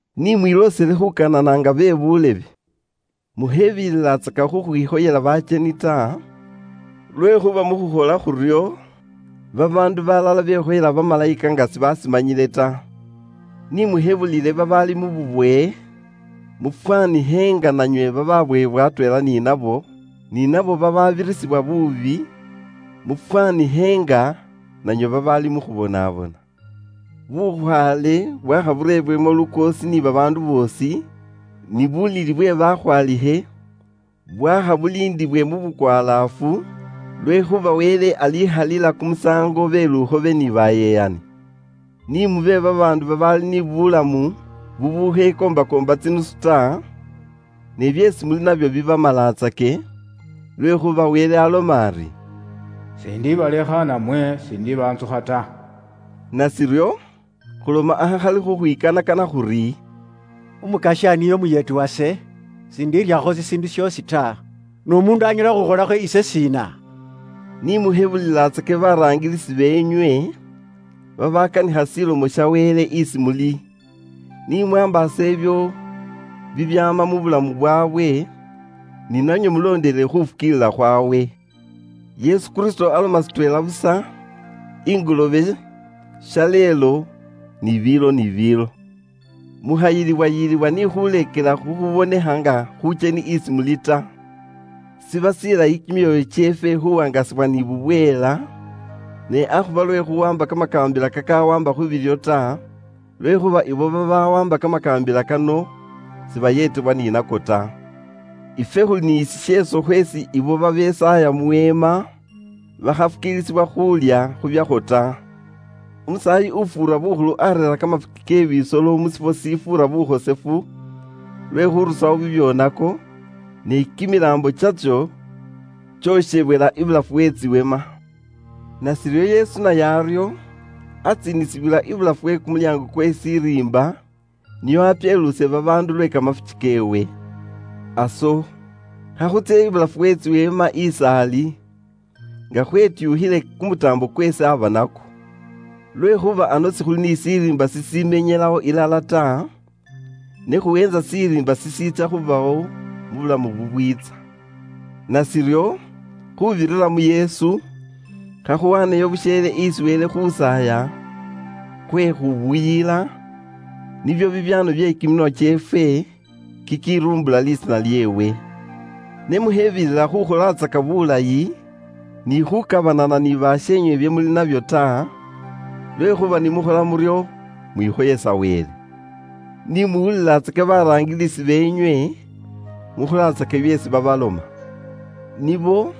Ni mwiloosele khuukanana nga be buulebe. Mukhebililatsaka khukhwikhoyela bakyeni ta, lwekhuuba mu khukhola khuryo, babaandu balala bekhoyela bamalayika nga sibashimanyile ta. Ni mushebulile babaali mu bubowe, mufwanikhe nga nanywe bababowebwa atweela ni nabo, ni naabo bababirisibwa buubi; mufwanikhe nga nanywe babaali mu khubonabona. Bukhwaale bwaakha bureebwemo lukoosi ni babaandu boosi, ni bulili bwe bakhwaalikhe bwaakha khuuba nga sibulikho lisaanda lyoosi ta, lwekhuuba Wele alikhalila kumusaango be lukhobe ni bayeyani. Ni mube babaandu babaali ni bulamu bubukhalimo bulyaanga mu mapeesa ta, ne byeesi muli nabyo bibamalatsake, lwekhuuba Wele aloma ari: “S'indibalekha namwe s'indibaantsukha ta.” Nashiryo, khuloma akhali khukhwikanakana khuri, “Umukasya niye umuyeeti wase, s'indiiryakho shishiindu shoosi ta. N'umuundu anyala khukhukholakho ise shiina?” Ni mushebulilatsake baraangilisi beenywe, babaakanikha Ilomo ya Wele isi muli. Ni mwaambaase ibyo bibyaama musaambo indayi iye buulamu bwaabwe, ni nanywe mulondelele khuufukiilila khwaabwe. Yesu Kristo arama shitweela busa, ingoloobe, shaleelo, ni biilo ni biilo. Mukhayilibwayilibwa ni khuuleekela khukhuubonekha nga khuukyeni isi muli ta. Shiba shilayi kimyoyo kyeefwe khuuwaangasibwa ni bubweela, ne akhuba lwe khuuwaamba kamakaambila kakawaamba khu biilyo ta, lwekhuuba abo babawaamba kamakaambila kano sibayeetebwa ni nako ta. Ifwe khuli ni shisheeso khweesi abo babesaaya mu weema bakhafukiilisibwa khuulya khubyakhwo ta. Umusaayi ufuura bukhulu areera kamafuki ke bisolo mu shifwo shifuura bukhosefu lwe khurusawo bibyoonako, ne kimilaambo kyatso kyokhebwela ibulafu we tsiweema. Nashiryo Yesu naye aryo, atsiinisiwila ibulafu we kumulyaango kwe shiriimba nio areerere babaandu bukhosefu lwe kamafuki keewe. Aso, khakhutsye ibulafu we tsiweema is'ali, nga khwetyuukhile kumutaambo kweesi aba nakwo. Lwekhuuba ano sikhuli ni shiriimba shishimenyelawo ilala ta, ne khuweentsa shiriimba shishiitsya khubawo mu bulamu bubwiitsa. Nashiryo, khuubirira mu Yesu, khakhuwaaneyo busheele isi Wele khusaaya khwe khubuyila, nibyo bibyaano bye kiminwa kyeefwe, kikiruumbula lisiina lyeewe. Ne mukhebilila khukholatsaka bulayi, ni khukabanana ni basheenywe bye muli nabyo ta, lwekhuuba bino bili nibyo biwaanwa bibikhoyesa Wele. Ni muwulilatsake baraangilisi beenywe, mukholatsake byeesi babaloma. Nibo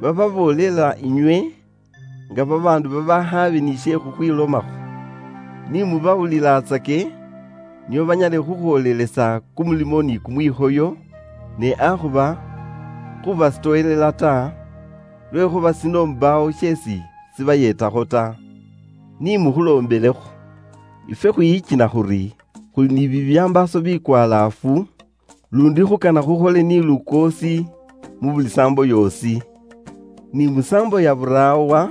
bababoolela inywe nga babaandu babaakhaabe ni she khukhwilomakho. Ni mubawulilatsake nio banyale khukhwoolelesa kumulimo ni kumwikhoyo, ne akhuba khubasitowelela ta, lwekhuuba shino mbaawo sheesi shibayeetakho ta. Ni mukhuloombelekho. Ifwe khwiyikina khuri, khuli ni bibyambaaso bikwalaafu, luundi khukana khwibirise ni lukoosi mu buli saambo yoosi. Ni musaambo ya buraawa,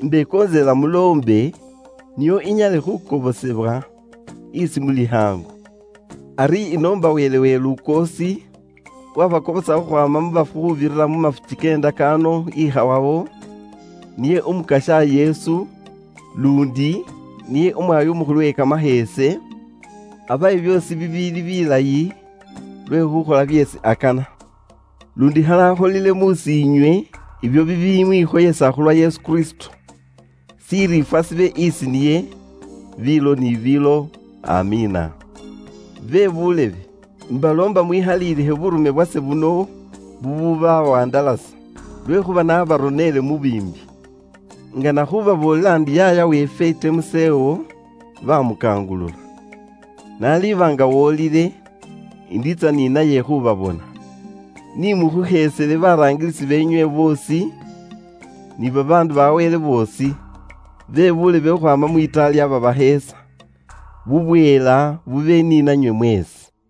imbekontselela muloombe, nio inyale khukobosebwa isi muli khaangu. Ari inoomba Wele uwe lukoosi, uwabakobosa khukhwaama mu bafu khuubirira mu mafuki ke ndakaano ikhawawo, niye Umukasya Yesu, luundi, niye Umwaayi Umukhulu we kamasheese, abawe byoosi bibiili bilayi lwe khukhola byeesi akana. Luundi khali akholile mus'iinywe ibyo bibimwikhoyesa khulwa Yesu Kristo. Shiriifwa shibe isi niye, biilo ni biilo. Amiina. Bebuulebe, imbaloomba mwikhalilikhe buurume bwase buno bububawandalasa, lwekhuuba naabaroneele mu biimbi. Ingana khubaboolela ndi yaaya weefwe Timosewo bamukangulula. N'aliba nga wolile, indiitsa ni naye khubabona. Ni mukhusheesele baraangilisi beenywe boosi, ni bakhosefu ba Wele boosi. Bebuulebe khukhwaama mu Itali babasheesa. Bubweela bube ni nanywe mweesi.